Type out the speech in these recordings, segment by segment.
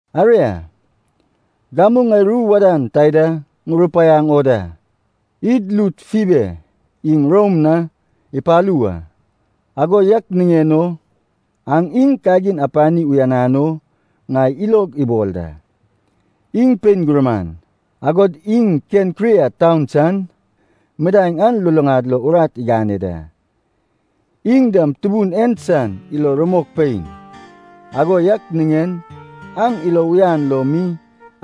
Aria, gamu ŋai ru wadan taida ŋurupaiaŋ o da. Id lud Fibe iŋ Rom na ipalu wa, ago yak niŋen o aŋ iŋ kagin apani uyanan o ŋai ilog ibol da. Iŋ pein gurman, agod iŋ Kenkria taun san midaeŋ an luluŋad lo urat igane da. Iŋ dam Tubun en san ilo rumok pein, ago yak niŋen aŋ ilo uyan lo mi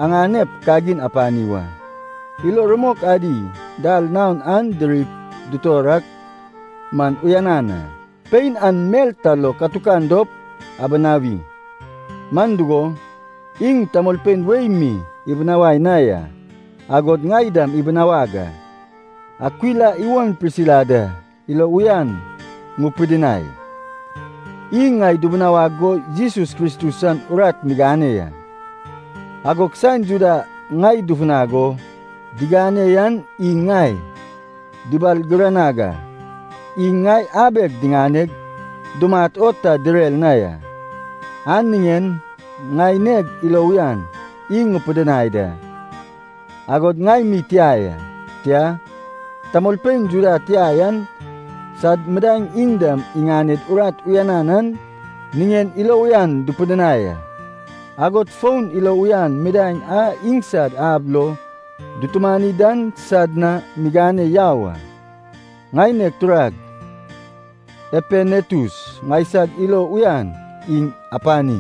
aŋanep kagin apani wa. Ilo rumok adi dal naon an dirip dutor ak man uyanan a. Pein an mel ta lo katukan dop abinawi. Man dugo, iŋ tamolpein wei mi ibinawai na ya, agod ŋai dam ibinawag a. Akwila iwon Prisila da ilo uyan ŋupidinai, iŋ ŋai dibinawag go Jesus Kristus san urat migane ya. Agog saen Juda ŋai dufunag o digane yan iŋ ŋai dubalgiranag a, iŋ ŋai abeg diŋaneg dumat o ta direr na ya. An niŋen ŋaineg ilo uyan iŋ ŋupidinai da, agod ŋai mi tia ya, tia, tamolpein Juda tia yan sad midaeŋ iŋ dam iŋaned urat uyanan an niŋen ilo uyan dupidinai a. Agod fon ilo uyan midaeŋ a iŋsad ab lo dutumani dan sad na migane yau a. Ŋaineg turag Epenetus ŋaisag ilo uyan iŋ apani,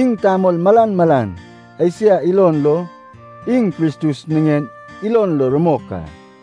iŋ tamol malan malan Esia ilon lo iŋ Kristus niŋen ilon lo rumok a.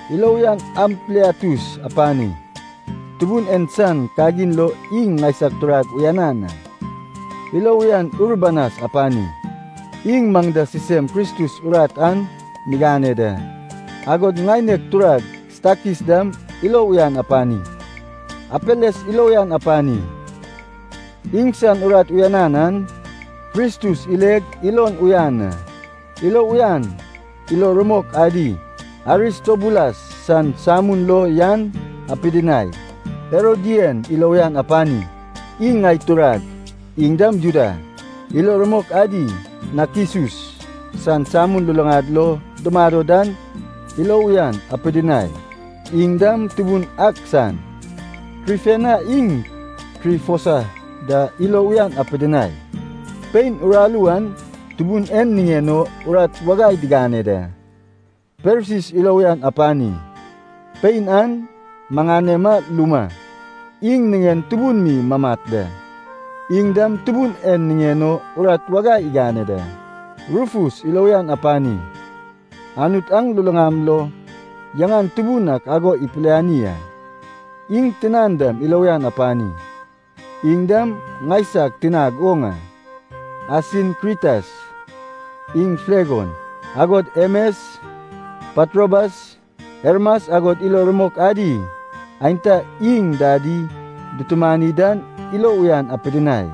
Ilo uyan Ampliatus apani, Tubun en san kagin lo iŋ ŋaisag turag uyanan a. Ilo uyan Urbanas apani, iŋ maŋ da sisem Kristus urat an migane da, agod ŋaineg turag Stakis dam ilo uyan apani. Apeles ilo uyan apani, iŋsan urat uyanan an Kristus ileg ilon uyan a. Ilo uyan ilo rumok adi Aristobulas san samun lo yan apidinai. Herodian ilo uyan apani, iŋ ŋai turag, iŋ dam Juda. Ilo rumok adi Nakisus san samun luluŋad lo dumado dan ilo uyan apidinai, iŋ dam Tubun ak san. Trifena iŋ Trifosa da ilo uyan apidinai, pein uraru an Tubun en niŋen o urat wagai digane da. Persis ilo uyan apani, pein an maŋanema luma, iŋ niŋen tubun mi mamat da, iŋ dam Tubun en niŋen o urat wagai igane da. Rufus ilo uyan apani, Anut aŋ luluŋam lo yaŋan tubun ak ago ipiliani a. Iŋ tinan dam ilo uyan apani, iŋ dam ŋaisag tinag oŋ a. Asinkritas iŋ Flegon, agod Hemes, Patrobas, Hermas agod ilo rumok adi aenta iŋ dadi dutumani dan ilo uyan apidinai.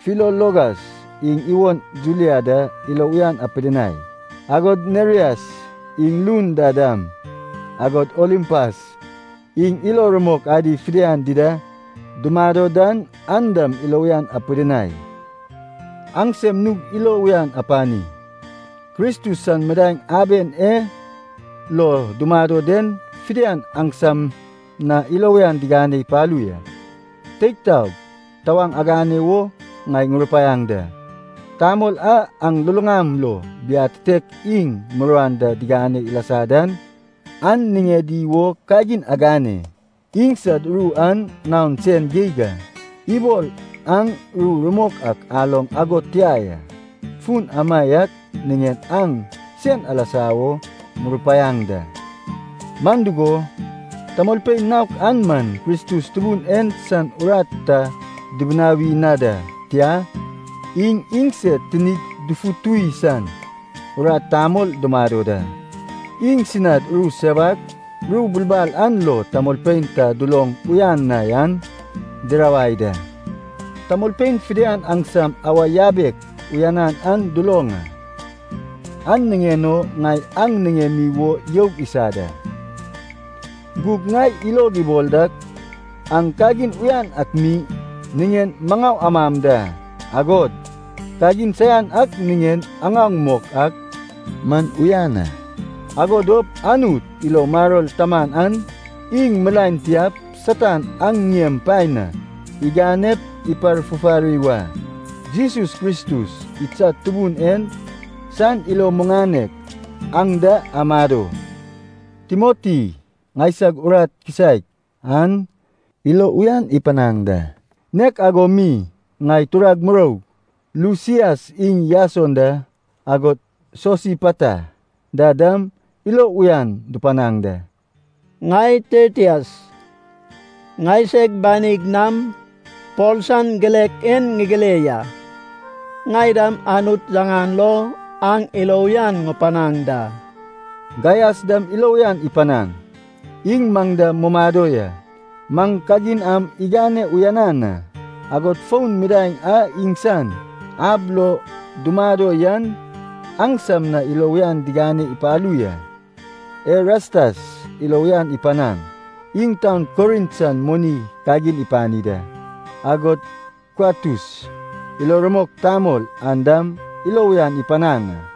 Filologas iŋ iwon Julia da ilo uyan apidinai, agod Nerias iŋ lun da dam, agod Olimpas iŋ ilo rumok adi fidian dida dumado dan an dam ilo uyan apidinai. Aŋsem nug ilo uyan apani. Kristus san midaeŋ aben e lo dumado den fidian aŋsam na ilo uyan digane ipalu ya. Teig taog, tawaŋ agane wo ŋai ŋurupaiaŋ da. Tamol a aŋ luluŋam lo biatitek iŋ muruan da digane ilasa dan, an niŋedi wo kagin agane. Iŋsad ru an naon sen geig a, ibol aŋ ru rumok ak aloŋ ago tia ya. Fun amaiak niŋen aŋ sen alasa wo ŋurupaiaŋ da. Man dugo, tamolpein naok an man Kristus Tubun en san urat ta dubinawi na da, tia, iŋ iŋsed tinid dufutuwi san urat tamol dumado da. Iŋsinad ru sewak, ru bulbal an lo tamolpein ta duloŋ uyan na yan dirawai da. Tamolpein fidian aŋsam awa yabek uyanan an duloŋ a, an niŋen o ŋai aŋ niŋemi wo youg isa da. Gug ŋai ilog ibol dak aŋ kagin uyan ak mi niŋen maŋau amam da, agod kagin saian ak niŋen aŋaoŋ mok ak man uyan a. Ago dop Anut, ilo maror taman an, iŋ milaen tiap Satan aŋ ŋiem paen na iganep iparfufari wa. Jesus Kristus idsad Tubun en san ilo muŋanek aŋ da amado. Timoti, ŋaisag urat kisaek an, ilo uyan ipanaŋ da. Nek ago mi ŋai turag muroug, Lusias iŋ Jason da agod Sosipata da dam ilo uyan dupanaŋ da. Ŋai Tertias, ŋaiseg banig nam Pol san girek en ŋigire ya. Ŋai dam Anut yaŋan lo aŋ ilo uyan ŋupanaŋ da. Gaias dam ilo uyan ipanaŋ. Iŋ maŋ da mumado ya, maŋ kagin am igane uyanan a. Agod fon midaeŋ a iŋsan ab lo dumado yan aŋsam na ilo uyan digane ipalu ya. Erastas ilo uyan ipanaŋ. Iŋ taun Korint san moni kagin ipani da. Agod Kuatus ilo rumok tamol an dam ilo uyan ipanaŋ a.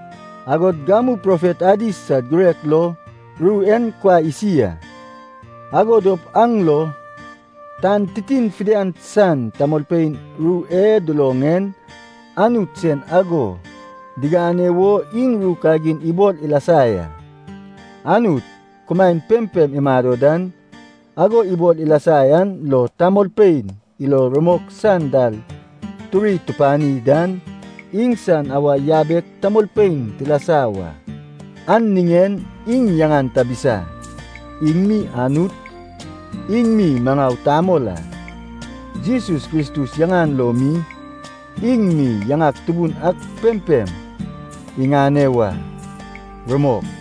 Agod gamu profet adi sad girek lo ru en kuai isi a. Ago dop an lo tan titin fidian san tamolpein ru e duloŋ en Anut sen ago digane wo iŋ ru kagin ibol ilasa ya. Anut, kumaen pempem imado dan, ago ibol ilasa an lo tamolpein ilo rumok san dal turi tupani dan, iŋsan awa yabek tamolpein tilasa wa. An niŋen iŋ yaŋan tabisa. Iŋ mi Anut, iŋ mi maŋau tamol a. Jesus Kristus yaŋan lo mi, iŋ mi yaŋak tubun ak pempem iŋane wa. Rumok.